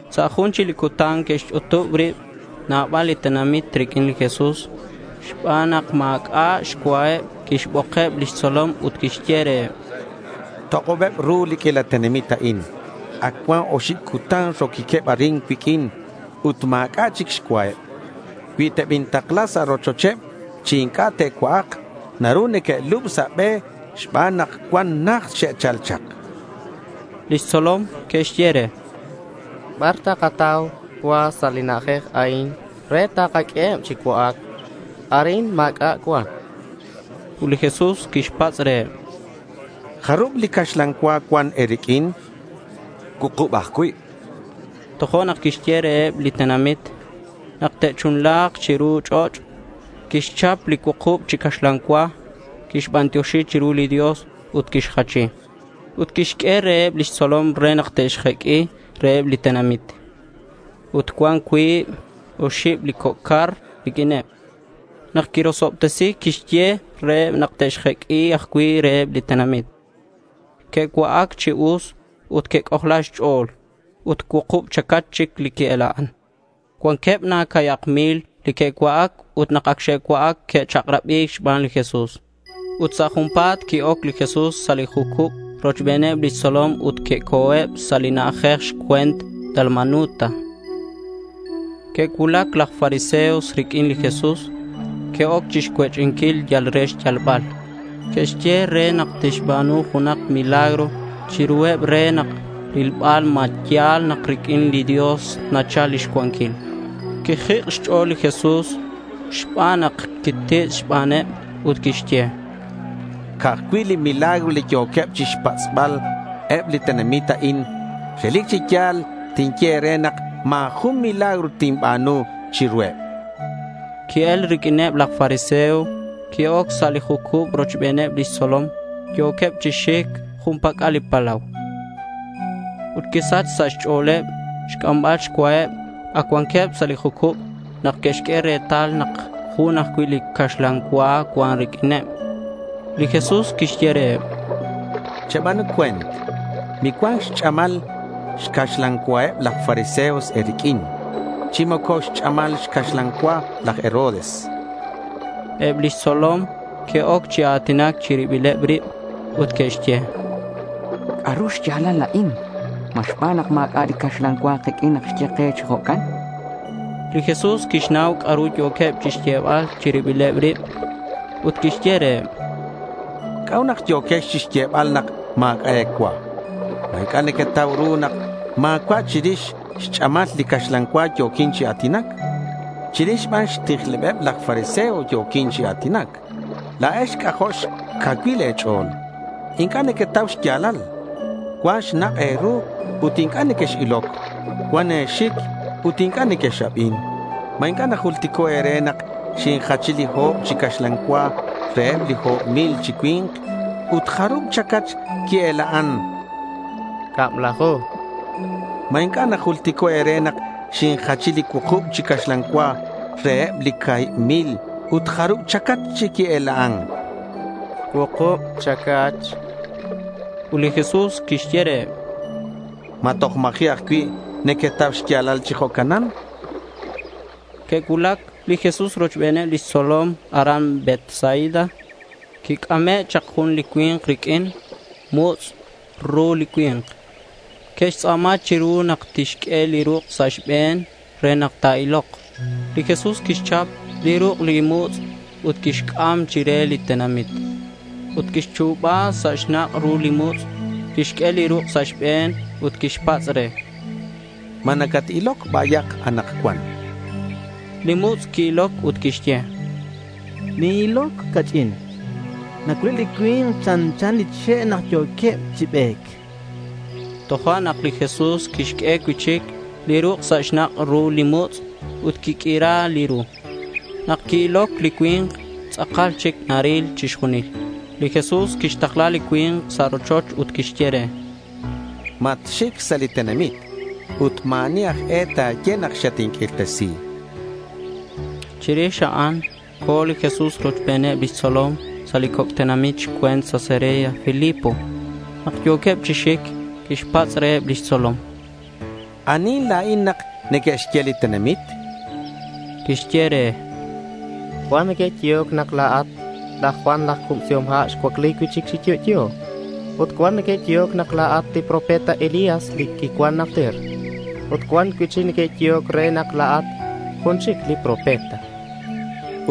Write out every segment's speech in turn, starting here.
Sa' jun chic li cutan que'xch'utub rib nabal li tenamit riq'uin li Jesús. Xban nak ma̱c'a' xcuaheb quixbokeb lix tzolom ut quixye reheb: —Tok'obeb ru li q'uila tenamit a'in. Ac cuan oxib cutan roquiqueb arin cuiq'uin ut ma̱c'a' chic xcuaheb. Cui tebintakla sa' rochocheb chi inc'a' te'cua'ak, naru neque'lub sa' be xban nak cuan najt xe'chal chak.— Lix tzolom que'xye re: —¿Bar takatau cua sa' li na'ajej a'in re takaq'ueheb chi cua'ac? Arin ma̱c'a' cuan, chanqueb. Ut li Jesús quixpatz' reheb: —¿Jarub li caxlan cua cuan e̱riq'uin? chan. —Cuukub ajcui', chanqueb. Tojo'nak quixye reheb li tenamit nak te'chunla̱k chiru ch'och'. Quixchap li cuukub chi caxlan cua. Quixbantioxi chiru li Dios ut quixjachi. Ut quixq'ue reheb lix tzolom re nak te'xjeq'ui reheb li tenamit. Ut cuan cuib oxib li coc' car riq'uineb. Nak quirosobtesi quixye reheb nak te'xjeq'ui ajcui' reheb li tenamit. Que'cua'ac chi us ut que'c'ojla xch'o̱l. Ut cuukub chacach chic li qui-ela'an. Cuanqueb na ca̱hibak mil li que'cua'ac ut nak ac xe'cua'ac, que'chak'rabi̱c xban li Jesús. Ut sa' junpa̱t qui-oc li Jesús sa' li jucub rochbeneb lix tzolom ut que'co̱eb sa' li na'ajej xcue̱nt Dalmanuta. Que'cuulac laj fariseo riq'uin li Jesús. Que'oc chixcuech'inquil yal re xyalbal. Que'xye re nak tixba̱nu junak milagro chiruheb re rilbal ma ya̱l na nak riq'uin li Dios nachal lix cuanquil. Quixjik' xch'o̱l li Jesús xban nak quititz' xbaneb, ut quixye: —Ca'aj cui' milagro yo̱queb chixpatz'bal eb li tenamit a'in. Relic chi ya̱l tinye e̱re nak ma̱ jun milagro tinba̱nu chiruheb.— Qui-el riq'uineb laj fariseo. Qui-oc sa' li jucub rochbeneb lix tzolom. Yo̱queb chi xic jun pac'al li palau. Ut quisach sa' xch'o̱leb xc'ambal xcuaheb. Ac cuanqueb sa' li jucub nak que'xq'ue retal nak jun ajcui' li caxlan cua cuan riq'uineb. Li Jesús quixye reheb: —Cheba̱nu cue̱nt. Micuan xch'amal xcaxlan cuaheb laj fariseo e̱riq'uin chi moco xch'amal xcaxlan cua laj Herodes.— Eb lix tzolom que'oc chi a̱tinac chi ribileb rib ut que'xye: —¿C'a'ru xya̱lal a'in? ¿Ma xban nak ma̱c'a' li caxlan cua kiq'uin nak xye ke chi jo'can? chanqueb. Li Jesús quixnau c'a'ru yo̱queb chixyebal chi ribileb rib ut quixye reheb: —¿C'a'ut nak yo̱quex chixyebal nak ma̱c'a' e̱cua? ¿Ma inc'a' nequetau ru nak ma̱cua' chirix xch'amal li caxlan cua yo̱quin chi a̱tinac? Chirix ban xtijlebeb laj fariseo yo̱quin chi a̱tinac. La̱ex c'ajo' xcacuil e̱ch'o̱l. Inc'a' nequetau xya̱lal. Cuan xnak' e̱ru ut inc'a' nequex-iloc. Cuan e̱xic ut inc'a' nequex-abin. ¿Ma inc'a' najultico' e̱re nak xinjachi li o̱b chi caxlan cua reheb li o̱b mil chi cui̱nk? Ut ¿jarub chacach qui-ela'an? chan reheb. —Cablaju, chanqueb. —¿Ma inc'a' najultico' e̱re nak xinjachi li cuukub chi caxlan cua reheb li ca̱hib mil. Ut jarub chacach qui-ela'an? chan reheb. —Cuukub chacach, chanqueb. Ut li Jesús quixye reheb: —¿Ma toj ma̱ji' ajcui' nequetau xya̱lal chi jo'canan?— Que'cuulac li Jesús rochbeneb lix tzolom aran Betsaida. Quic'ame' chak jun li cui̱nk riq'uin. Mutz' ru li cui̱nk. Que'xtz'a̱ma chiru nak tixq'ue li ruk' sa' xbe̱n re nak ta̱ilok. Li Jesús quixchap li ruk' li mutz' ut quixc'am chire li tenamit. Ut quixchu̱ba sa' xnak' ru li mutz'. Quixq'ue li ruk' sa' xbe̱n ut quixpatz' re: —¿Ma nacat-iloc bayak anakcuan? chan re. Li mutz' qui-iloc ut quixye: —Nin-iloc ca'ch'in. Nacuileb li cui̱nk chanchaneb li che' nak yo̱queb chi be̱c.— Tojo'nak li Jesús quixq'ue cui'chic li ruk' sa' li xnak' ru li mutz' ut quiq'uira li ru. Nak qui-iloc li cui̱nk, tz'akal chic naril chixjunil. Li Jesús quixtakla li cui̱nk sa' rochoch ut quixye re: —Matxic sa' li tenamit ut ma̱ ani aj e ta̱ye nak xatinq'uirtesi, chan re. Chirix a'an co̱ li Jesús rochbeneb lix tzolom sa' li coc' tenamit xcue̱nt Cesarea Filipo. Nak yo̱queb chi xic, quixpatz' reheb lix tzolom: —¿Anihin la̱in nak neque'xye li tenamit? chan. Que'xye re: —Cuan neque'yehoc re nak la̱at laj Juan laj Cubsihom Ha' xcuacli cui'chic chi yo'yo. Ut cuan neque'yehoc re nak la̱at li profeta Elías, li quicuan najter. Ut cuan cui'chic neque'yehoc re nak la̱at jun chic li profeta, chanqueb.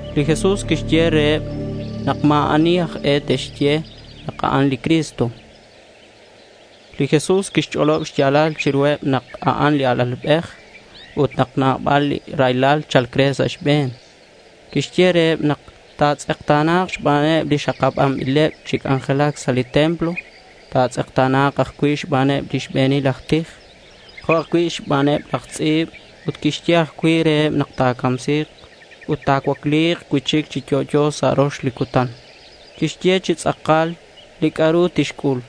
Li Jesús quixye reheb nak ma̱ ani aj e te'xye nak a'an li Cristo. Li Jesús quixch'olob xya̱lal chiruheb nak a'an li Alalbej ut nak nabal li raylal cha̱lc re sa' xbe̱n. Quixye reheb nak ta̱tz'ekta̱na̱k xbaneb li xakabanbileb chi c'anjelac sa' li templo. Ta̱tz'ekta̱na̱k ajcui' xbaneb li xbe̱nil aj tij. Jo' ajcui' xbaneb laj tz'i̱b ut quixye ajcui' reheb nak ta̱camsi̱k ut ta̱cuacli̱k cui'chic chi yo'yo sa' rox li cutan. Quixye chi tz'akal li c'a'ru tixc'ul.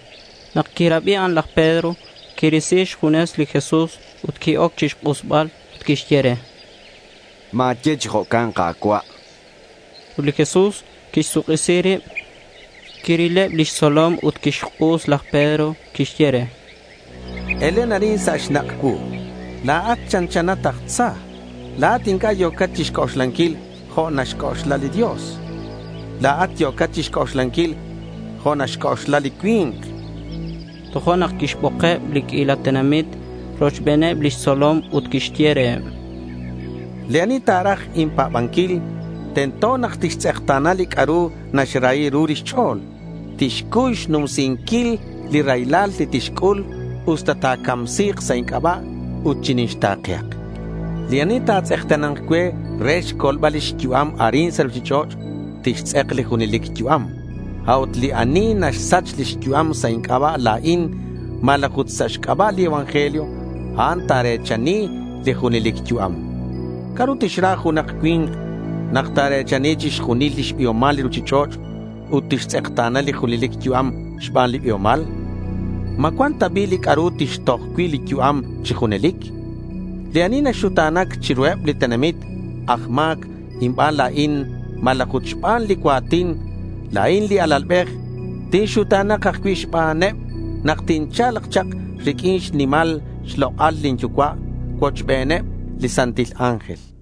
Nak quirabi a'an laj Pedro quirisi xjunes li Jesús ut qui-oc chixk'usbal ut quixye re: —Ma̱ye chi jo'can Ka̱cua'.— Ut li Jesús quixsuk'isi rib. Quirileb lix tzolom ut quixk'us laj Pedro. Quixye re: —Elen arin sa' xnak' cuu. La̱at chanchanat aj Tza. La̱at inc'a' yo̱cat chixc'oxlanquil jo' naxc'oxla li Dios. La̱at yo̱cat chixc'oxlanquil jo' naxc'oxla li cui̱nk, chan. Tojo'nak quixbokeb li q'uila tenamit rochbeneb lix tzolom ut quixye reheb: —Li ani ta̱raj inpa̱banquil, tento nak tixtz'ekta̱na li c'a'ru naxrahi ru lix ch'o̱l. Tixcuy xnumsinquil li raylal li tixc'ul usta ta̱camsi̱k sa' inc'aba'. Ut chinixta̱kehak. Li ani ta̱tz'ekta̱na̱nk cue re xcolbal lix yu'am arin sa' ruchich'och', tixtz'ek li junelic yu'am. A'ut li naxsach lix yu'am sa' inc'aba' la̱in malaj ut sa' xc'aba' li evangelio, a'an ta̱re̱chani li junelic yu'am. ¿C'a'ru tixra junak cui̱nk nak ta̱re̱chani chixjunil lix biomal li ruchich'och' ut tixtz'ekta̱na li junelic yu'am xban li biomal? ¿Ma cuan ta bi' li c'a'ru tixtoj cui' li yu'am chi junelic? Li ani ta̱xuta̱na̱k chiruheb li tenamit aj ma̱c inban la̱in malaj ut xban li cua̱tin, la̱in li Alalbej tinxuta̱na̱k ajcui' xbaneb nak tincha̱lk chak riq'uin xnimal xlok'al lin Yucua' cuochbeneb li santil ángel.—